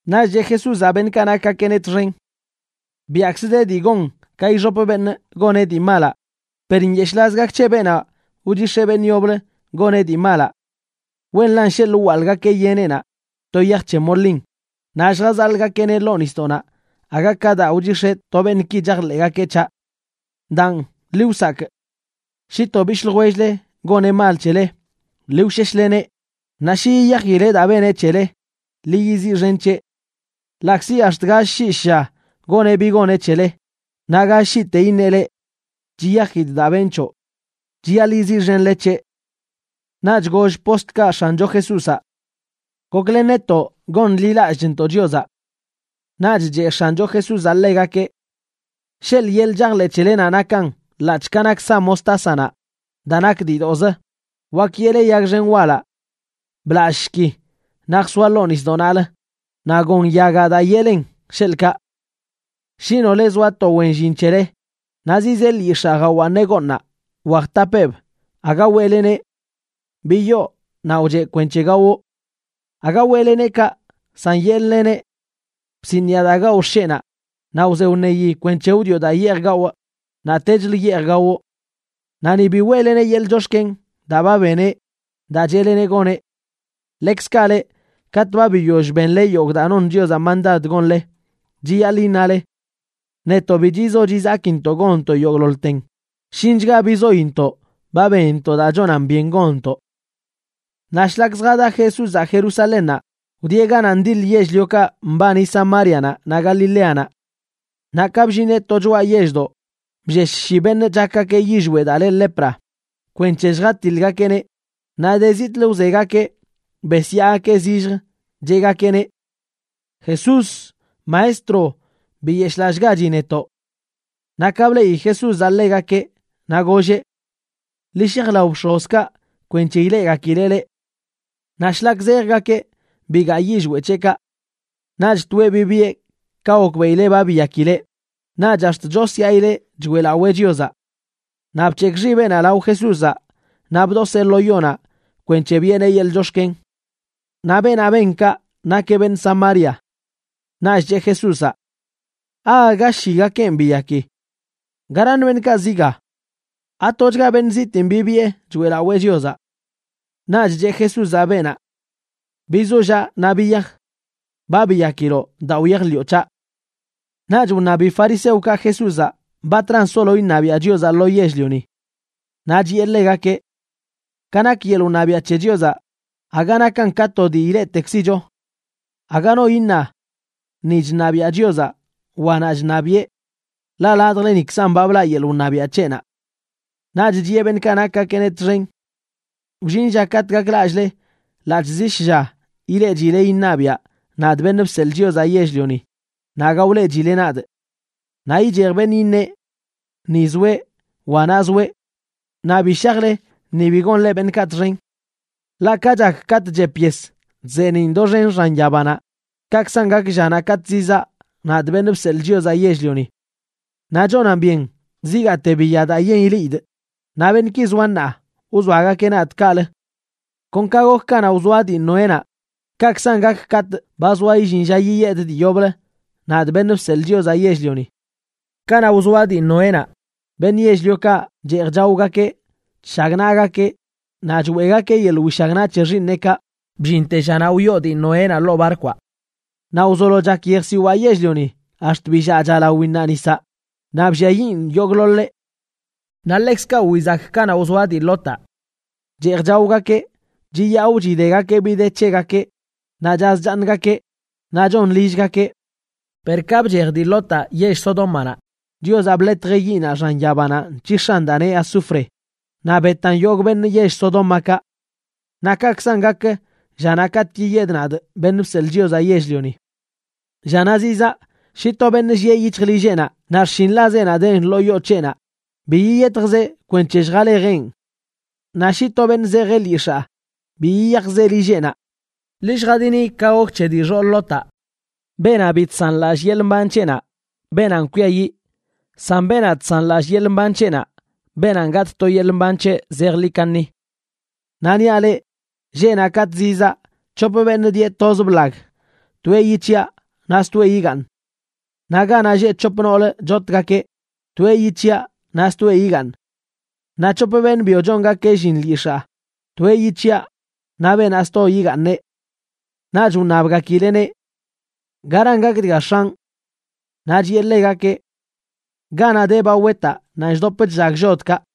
Naꞌch cheꞌ Jesúzaꞌ beṉꞌkaꞌ nakgakeꞌneꞌ txen: ―Biaꞌkzə de dii gon ka ixop beṉꞌ goneꞌ dii malaꞌ, per ¡nyeshꞌlaz gak c̱he beenaꞌ wchix̱eꞌ beṉꞌ yoblə goneꞌ dii malaꞌ! Wenlan sheḻꞌ wwaḻꞌgakeꞌ yeneꞌnaꞌ to yaj c̱he molin naꞌ lljazaḻꞌgakeꞌneꞌ ḻoo nisdoꞌnaꞌ aga ka daa wchix̱eꞌ to beṉꞌki chajḻeꞌgakeꞌ c̱haꞌ. Daan, ḻi wsakꞌ. ’Shi to bishꞌ ljwell-le goneꞌ mal c̱hele, ḻi wsheshleneꞌ, naꞌ shi yiyajileꞌ daa beneꞌ c̱hele, ḻi yiziꞌxen c̱heꞌ. Ḻaꞌkzi ax̱t gall shii shlla goneꞌ bi goneꞌ c̱hele, naꞌ gall shiite iṉeꞌ leꞌ: “Chiyajidꞌ daa benꞌ c̱hoꞌ”, chiyaḻꞌ yiziꞌxenle c̱heꞌ. Naꞌch goll postlkaꞌ X̱ancho Jesúzaꞌ: ―Goklen netoꞌ gonḻilallꞌchntoꞌ Chiozaꞌ. Naꞌch cheꞌ X̱ancho Jesúzaꞌ ḻegakeꞌ: ―Sheḻꞌ yeḻꞌ chajḻeꞌ c̱helenaꞌ nakan ḻaꞌc̱hꞌ ka nak sa mostásanaꞌ, daa nak diidoꞌzə, wak yeꞌle yag xen walaꞌ: “Blallꞌshki, naꞌ jsoa ḻoo nisdoꞌ naꞌlə”, naꞌ gon yagaꞌ daa yeꞌlen, sheḻꞌkaꞌ. ’Shi nole zoa to wen llin c̱hele naꞌ zizee lyix̱aa jawaaṉeꞌ gooṉnaꞌ wa jtapeeb, aga weꞌleneꞌ: “Biyoo, naꞌ wcheꞌ kwenc̱he gawoꞌ.” Aga weꞌleneꞌ kaꞌ, san yeꞌl-leneꞌ: “Bsiniꞌa daa gawꞌ xsheꞌnaꞌ, naꞌ wze wṉeyi kwenc̱he wdioꞌ daa yeej gawꞌ, naꞌtechlə yeej gawoꞌ.” Naꞌ ni bi weꞌleneꞌ yeḻꞌ chox̱ken daa ba beneꞌ daa cheꞌleneꞌ goneꞌ. Ḻekzkaꞌ leꞌ, katꞌ ba biyoll benle yogꞌ daa non Chiozaꞌ mandad gonle, chiyaḻꞌ iṉale: “Netoꞌ bi chizo chizakintoꞌ gonntoꞌ yogꞌḻoḻten, shinchga bizointoꞌ ba benntoꞌ daa chonan byen gonntoꞌ.” Naꞌ shlak zjada Jesúzaꞌ Jerusalénnaꞌ, wdieꞌ ganaꞌ ndiḻ yell-liokaꞌ mbani Samárianaꞌ naꞌ Galileanaꞌ. Naꞌ ka bllineꞌ to choꞌa yelldoꞌ, bllesh shi beṉꞌ chakgakeꞌ yillweꞌ daa le lepra kwenc̱he lljatiḻgakeꞌneꞌ, naꞌ de zitꞌlə wzegakeꞌ besyaagakeꞌ zilljə, cheꞌgakeꞌneꞌ: ―¡Jesús, Maestro, biyeshꞌlallꞌgachi netoꞌ! Naꞌ ka bleꞌi Jesúzaꞌ ḻegakeꞌ, naꞌ golleꞌ: ―Ḻi shaj lao bx̱ozkaꞌ kwenc̱he ileꞌgakileꞌ leꞌ. Naꞌ shlak zejgakeꞌ bigaa yillweꞌ c̱heꞌkaꞌ. Naꞌch toeꞌ bibiꞌe ka gokbeꞌileꞌ ba biyakileꞌ, naꞌch ax̱t chosyaꞌileꞌ choeꞌlawee Chiozaꞌ. Naꞌ bc̱hekꞌ xibeꞌnaꞌ lao Jesúzaꞌ naꞌ bdoseꞌ lo yonaꞌ kwenc̱he biꞌeneꞌ yeḻꞌ chox̱ken. Naꞌ beenaꞌ ben kaꞌ nakeꞌ beṉꞌ Samaria. Naꞌch cheꞌ Jesúzaꞌ: ―¿Aaga shigakenꞌ biyaki? ¿Garaṉ beṉꞌkaꞌ zi ga? ¿Atochga beṉꞌ zitiin bibiꞌe choeꞌlawee Chiozaꞌ? Naꞌch cheꞌ Jesúzaꞌ beenaꞌ: ―Bizollaꞌ naꞌ biyaj. Ba biyakiloꞌ daa wyajḻiꞌo c̱haꞌ. Naꞌch wṉabi fariseokaꞌ Jesúzaꞌ batran solo iṉabiaꞌ Chiozaꞌ lo yell-lioni. Naꞌ chiꞌe ḻegakeꞌ: ―Ka nak yeḻꞌ wṉabiaꞌ c̱he Chiozaꞌ, aga nakan ka to dii ileꞌtekzicho. Aga no iṉa: “Ni chṉabiaꞌ Chiozaꞌ”, wa “Naꞌ chṉabiꞌe”, ḻaꞌ ladjlenikzan ba blaꞌ yeḻꞌ wṉabiaꞌ c̱heꞌnaꞌ. Naꞌch chiꞌe beṉꞌkaꞌ nakgakeꞌneꞌ txen: ―Wllin lla katꞌ gaklallꞌle ḻaꞌc̱hꞌ zi shlla ileꞌchile iṉabiꞌa, nadꞌ, Beṉꞌ Bseḻꞌ Chiozaꞌ Yell-lioni, naꞌ aga wleꞌchile nadꞌ. Naꞌ ichej beṉꞌ iṉeꞌ: “Ni zoeꞌ”, wa “Naꞌ zoeꞌ.” Naꞌ bi shajle, ni bi gonle beṉꞌkaꞌ txen. Ḻaꞌ ka chak katꞌ chep yes, chzeeniꞌn doxen xan yabanaꞌ, kaꞌkzan gak llanaꞌ katꞌ zizaa, nadꞌ, Beṉꞌ Bseḻꞌ Chiozaꞌ Yell-lioni. Naꞌ chonan byen zigaate biya daa yen ileꞌidꞌ, naꞌ beṉꞌki zoa ṉaa wzoagakeꞌ nadꞌ kaꞌlə. Kon ka gok kanaꞌ wzoa dii Noénaꞌ, kaꞌkzan gak katꞌ ba zoa illin lla yiyedꞌ dii yoblə, nadꞌ, Beṉꞌ Bseḻꞌ Chiozaꞌ Yell-lioni. Kanaꞌ wzoa dii Noénaꞌ, beṉꞌ yell-liokaꞌ cheej chaogakeꞌ, chshagnaꞌgakeꞌ, naꞌ choeꞌgakeꞌ yeḻꞌ wishagnaꞌ c̱he xiiṉeꞌkaꞌ bllinte llanaꞌ wyoo dii Noénaꞌ ḻoo barkwaꞌ. Naꞌ wzolo chak yejsiwaa yell-lioni ax̱t billaꞌcha lawinnaꞌ nisaꞌ, naꞌ blliayiꞌn yogꞌḻoḻeꞌ. Naꞌ ḻekzkaꞌ wizak kanaꞌ wzoa dii Lotaꞌ. Cheej chaogakeꞌ, chiyaꞌo chidegakeꞌ bi de c̱hegakeꞌ, naꞌ chaz chaaṉgakeꞌ, naꞌ chon lillgakeꞌ. Per ka bchej dii Lotaꞌ yell Sodómanaꞌ, Chiozaꞌ bḻetjeꞌ yiꞌnaꞌ xan yabanaꞌ nc̱hix̱an daa neꞌ azufre naꞌ betan yogꞌ beṉꞌ yell Sodómakaꞌ. Naꞌ kaꞌkzan gak llanaꞌ katꞌ yiyedꞌ, nadꞌ, Beṉꞌ Bseḻꞌ Chiozaꞌ Yell-lioni. ’Llanaꞌ zizaa, shi to beṉꞌ llieꞌ yic̱hj lilleꞌnaꞌ naꞌ xshinḻazeꞌnaꞌ den ḻoo yoo c̱heꞌnaꞌ, bi yiyetjzeꞌ kwenc̱he lljalejeꞌn. Naꞌ shi to beṉꞌ zejeꞌ lyix̱aa, bi yiyajzeꞌ lilleꞌnaꞌ. Ḻi lljadini ka gok c̱he dii xool Lotaꞌ. Beenaꞌ bi chsanlallꞌ yeḻꞌ mban c̱heꞌnaꞌ, beenanꞌ kwiayiꞌ; san beenaꞌ chsanlallꞌ yeḻꞌ mban c̱heꞌnaꞌ, beenanꞌ gatꞌ to yeḻꞌ mban c̱heꞌ zejḻi kaṉi. ’Naꞌ niaꞌ leꞌ, lleꞌnaꞌ katꞌ zizaa, c̱hop beṉꞌ dieꞌ toz blag, toeꞌ yic̱hiꞌa naꞌ stoeꞌ yigaaṉ. Naꞌ ganaꞌ lleꞌ c̱hop noolə chotgakeꞌ, toeꞌ yic̱hiꞌa naꞌ stoeꞌ yigaaṉ. Naꞌ c̱hop beṉꞌ byo chongakeꞌ llin lyix̱aa, toeꞌ yic̱hiꞌa naꞌ beenaꞌ sto yigaaṉeꞌ. Naꞌch wṉabgakileꞌneꞌ: ―¿Garan gak dga, X̱anꞌ? Naꞌ chiꞌe ḻegakeꞌ: ―Ganaꞌ de ba wetaꞌ, nanꞌ chdop chllag llodkaꞌ.